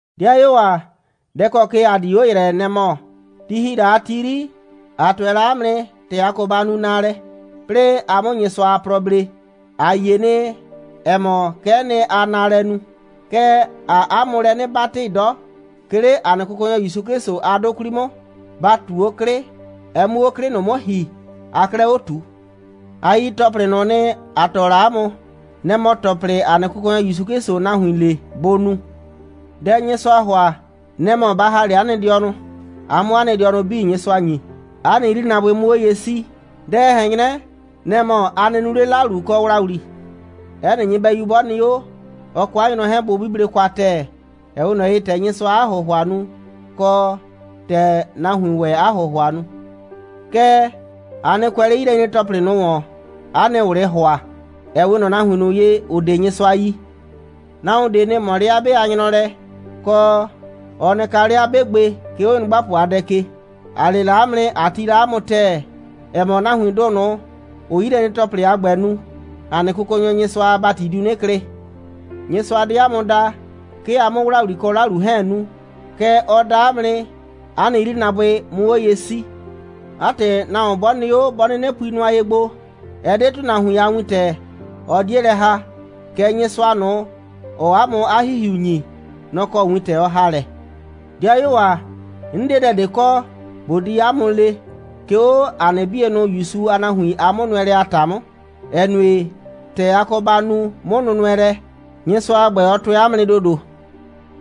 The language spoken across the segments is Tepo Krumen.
'Dɩayuo ‑a, dɛ ‑kɔ ke ‑a di 'o ‑yrɛ, nɛ‑ mɔ: Ti ‑hi la a ti 'yri, ‑a tʋɛ la 'a mʋ nɩ, ‑tɛ a kɔ ba nu naalɛ, 'plɩɩ a 'mʋ Nyɩsʋa a plɔ blee. ‑A yie nɩ, ‑ɛ mɔ, kɛ'ɛ nɩ, aa naalɛ nu, kɛɛ, ‑aa 'a mʋ lɛ 'nɩ 'batɩ 'dɔ, 'ke 'le ‑a nɩ Kʋkɔnyɔ ‑Yusu 'Klɩsʋ a 'dʋ 'kwli 'mʋ, ba ꞊tu 'o 'klɩ, ɛ 'mʋ 'o 'klɩ ꞊nʋ 'mʋ ‑hi, aa 'klɛɛ 'o ꞊tu. A yi ‑tɔplɩ ꞊nʋ nɩ, ‑a tɔɔ la 'a mʋ. Nɩ‑ mɔ ‑tɔplɩ, ‑a nɩ Kʋkɔnyɔ ‑Yusu 'Klɩsʋʋ nahuin le, bʋ nu. Dɛ Nyɩsʋaa ‑hʋa, nɛ‑ mɔ ba ‑ha 'le 'a nɩ dɩɔnʋ, a 'mʋ 'a nɩ dɩɔnʋ 'bii Nyɩsʋa ‑nyi, 'a nɩ 'yrinaabʋɩ 'mʋ 'o ye 'sii. Dɛ, ɛ ꞊hɛn 'nyrɛ, nɛ‑ mɔ, a nɩ nu 'le 'lalu kɔ ‑wlawli. 'Ɛ nɩ nyɩbɛyu 'bɔ nɩ 'o, ɔ kɔ 'a nyrɔ 'hɛɛn, bʋ 'buble kwa ‑tɛɛ, ‑ɛ 'we ꞊nɔ ye, ‑tɛ Nyɩsʋaa 'a ‑hʋhʋa nu, kɔ, ‑tɛ nahuiin ‑wɛ 'a ‑hʋhʋa nu. Kɛɛ, a nɩ kʋɛ 'le 'yilɛnyre‑tɔplɩ ꞊nʋ ‑wɔn, 'a nɩ ꞊wlɩɩ ‑hʋa, ‑ɛ 'we ꞊nɔ nahuin ꞊nʋ ye, ‑ʋ 'de Nyɩsʋa yi. Nahuon ꞊de nɩ ꞊mɔ 'le 'a 'be a nyrɔ lɛ, kɔ, ɔ nɩ kaa 'le 'a 'be gbe, 'ke 'o nyrʋgbapʋ a dɛ ke. ‑A le la 'a mʋ nɩ, ꞊a tii la 'a mʋ ‑tɛɛ, ‑ɛ mɔ, nahuindʋ ꞊nʋ, ‑ʋʋ 'yilɛnyre‑tɔplɩ a ‑gbɛ nu, ‑a nɩ Kʋkɔnyɔ Nyɩsʋa a ‑bati diu 'nɩ klɩ. Nyɩsʋa 'de ‑a mʋ da, 'ke ‑a 'mʋ ‑wlawli kɔ 'lalu 'hɛɛn nu. Kɛɛ, ɔ da ‑a mʋ nɩ, ‑a nɩ 'yrinaabʋɩ 'mʋ 'o ye 'sii. 'A ‑tɩ, nahuon 'bɔ nɩ 'o, 'bɔ 'nɩnɩ pui nʋa ye gbo, ɛ 'de ‑tʋnahuin a wintɛ, ɔ 'die lɛ ‑haa, kɛɛ, Nyɩsʋa ꞊nʋ, ‑ɔɔ 'a mʋ 'a ‑Hihiu ‑nyi, nɔ‑ kɔ wintɛ ɔ ‑haa lɛ. 'Dɩayuo ‑a, 'n 'de dɛ ꞊de kɔ, ꞊bo di 'a mʋ le, 'ke 'o 'a nɩ 'bienʋ ‑Yusu a nahuin a 'mʋnʋɛlɛ a ‑ta 'mʋ, ‑ɛ nue, ‑tɛ a kɔ ba nu 'mʋnʋnʋɛlɛ, Nyɩsʋa a ‑gbɛ, ɔ tʋɛ 'a mʋ nɩ ‑dodo.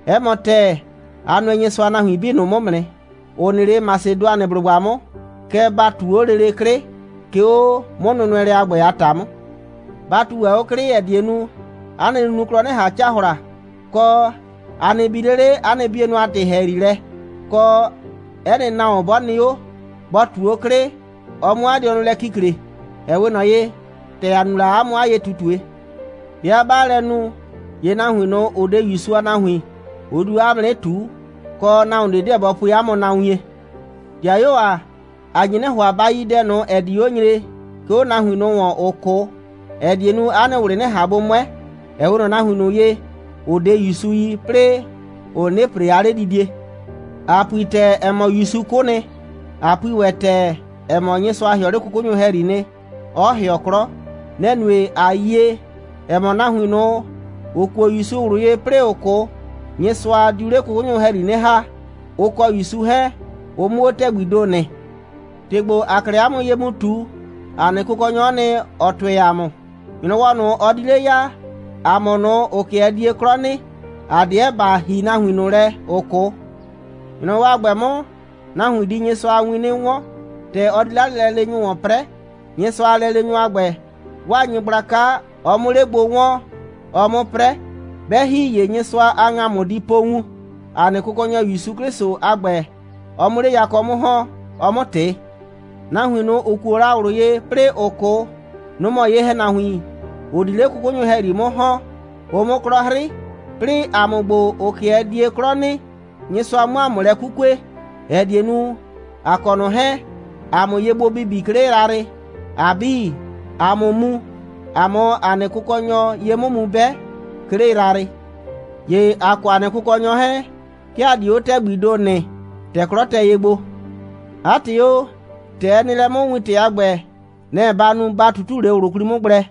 'Ɛ mɔ ‑tɛɛ, a nʋɛ Nyɩsʋa a nahuin 'bii ꞊nʋ 'mʋ nɩ, ‑ʋ nɩ 'le Masɩdʋanɩblʋgba 'mʋ. Kɛɛ, ba ꞊tu 'o lele 'klɩ, 'ke 'o 'mʋnʋnʋɛlɛ a ‑gbɛ a ‑ta 'mʋ. Ba ꞊tu ‑wɛ 'o 'klɩ, ‑ɛ die nu, 'a nɩ nunuklɔ 'nɩ ꞊han cahla, kɔ, a nɩ bi 'le 'le 'a nɩ 'bienʋ a ‑tɩ ‑hɛyri lɛ, kɔ, 'ɛ nɩ nahuon 'bɔ nɩ 'o, bɔ ꞊tu 'o 'klɩ, ɔ 'mʋ 'a dɩɔnʋ lɛ kikle, ‑ɛ 'we ꞊nɔ ye, ‑tɛ ‑a nu la 'a mʋ 'a ye꞊tutue. 'Bɩa 'baa lɛ nu, ‑ye nahuin ꞊nʋ, ‑ʋ 'de ‑Yusu a nahuin, ʋ di 'o 'a mʋ 'nɩ ꞊tuu, kɔ, nahuon ꞊de 'deɛ bɔ pue 'a mʋ na wien. 'Dɩayuo ‑a, ‑a nye 'nɩ ‑hʋa, ba yi dɛ ꞊nʋ, ‑ɛ di 'o nyre, 'ke 'o nahuin ꞊nʋ ‑wɔn, ‑ʋ 'kʋ, ‑ɛ die nu, 'a nɩ ꞊wlɩ 'nɩ ꞊han gbo 'mʋɛ, ‑ɛ 'we ꞊nɔ nahuin ꞊nʋ ye, ‑ʋ 'de ‑Yusu yi, 'plɩɩ ‑ʋ 'nɩnɩ ‑pre 'a 'ledidie. ‑A pui ‑tɛɛ, ‑ɛ mɔ, ‑Yusu 'kʋ nɩ, ꞊a pui ‑wɛ ‑tɛɛ, ‑ɛ mɔ, Nyɩsʋa ‑hɩɔ 'le 'kʋkʋnyʋ ‑hɛyri nɩ, 'ɔ ‑hɩɔ 'klɔ. Nɛ‑ nue, ꞊a yie, ‑ɛ mɔ, nahuin ꞊nʋ, ‑ʋ kuo ‑Yusu ꞊wlʋ ye, 'plɩɩ ‑ʋ 'kʋ, Nyɩsʋa diu 'le 'kʋkʋnyʋ ‑hɛyri 'nɩ ‑ha, ʋ kɔ ‑Yusu 'hɛɛn, ʋ 'mʋ 'o ‑tɛgbii ‑do nɩ. ‑Tɩ ‑gbo, ‑aa 'klɛɛ 'a mʋ ye mu ꞊tu, ‑a nɩ Kʋkɔnyɔ, nɔ‑ɔ nɩ, ‑ɔ tʋɩ ‑a mʋ: ‑Nyrɔwɔ ꞊nʋ, ɔ di 'le ya, ‑a mʋ ꞊nʋ, ‑ʋ 'kɩɛ die 'klɔ nɩ, ‑a 'deɛ ‑ba ‑hi nahuin ꞊nʋ lɛ, ‑ʋ 'kʋ. ‑Nyrɔwɔ a ‑gbɛ 'mʋ, nahuin di Nyɩsʋa a win 'nɩ 'wɔn, ‑tɛ ɔ di 'le 'a lɛleenyʋ ‑wɔn 'prɛɛ, Nyɩsʋa a lɛleenyʋ a ‑gbɛ, 'waa nyɩgblaka, ɔ 'mʋ 'le gbo 'wɔɔn, ɔ 'mʋ 'prɛ. 'Bɛ ‑hi, ‑ye Nyɩsʋa a ‑ŋamʋ di po wun, ‑a nɩ Kʋkɔnyɔ ‑Yusu 'Klɩsʋ a ‑gbɛ, ɔ 'mʋ 'le yakɔ 'mʋ ‑hɔn, ɔ 'mʋ ꞊tɩ. Nahuin ꞊nʋ, ‑ʋ kuo la ꞊wlʋ ye, 'plɩɩ ‑ʋ 'kʋ, nʋ‑ mɔ ye‑hɛnahuin, ‑ʋ 'di 'le 'kʋkʋnyʋ ‑hɛyri 'mʋ ‑hɔn, ʋ 'mʋ 'klɔ 'hrɩ, 'plɩɩ ‑a mʋ ‑gbo, ‑ʋ 'kɩɛ die 'klɔ nɩ, Nyɩsʋa 'mʋ ‑a mʋ lɛ 'kukue, ‑ɛ die nu, ‑a kɔ ꞊nʋ 'hɛɛn, ‑a 'mʋ ye gbo bibi, 'ke 'le yrayrɩ, ‑a 'bii, ‑a 'mʋ mu, ‑a 'mʋ ‑a nɩ Kʋkɔnyɔ ye 'mʋ mu 'bɛ, 'ke 'le yrayrɩ. ‑Ye ‑a kɔ ‑a nɩ Kʋkɔnyɔ 'hɛɛn, 'ke ‑a di 'o ‑tɛgbii ‑do nɩ, ‑tɛ 'klɔ tɛ ye gbo. 'A ‑tɩ o, ‑tɛ ɛ nɩ lɛ 'mʋ, wintɛ a ‑gbɛ, nɛ‑ ba nu, ba ꞊tutu 'le ꞊wlʋ 'kwli 'mʋ gblɛ.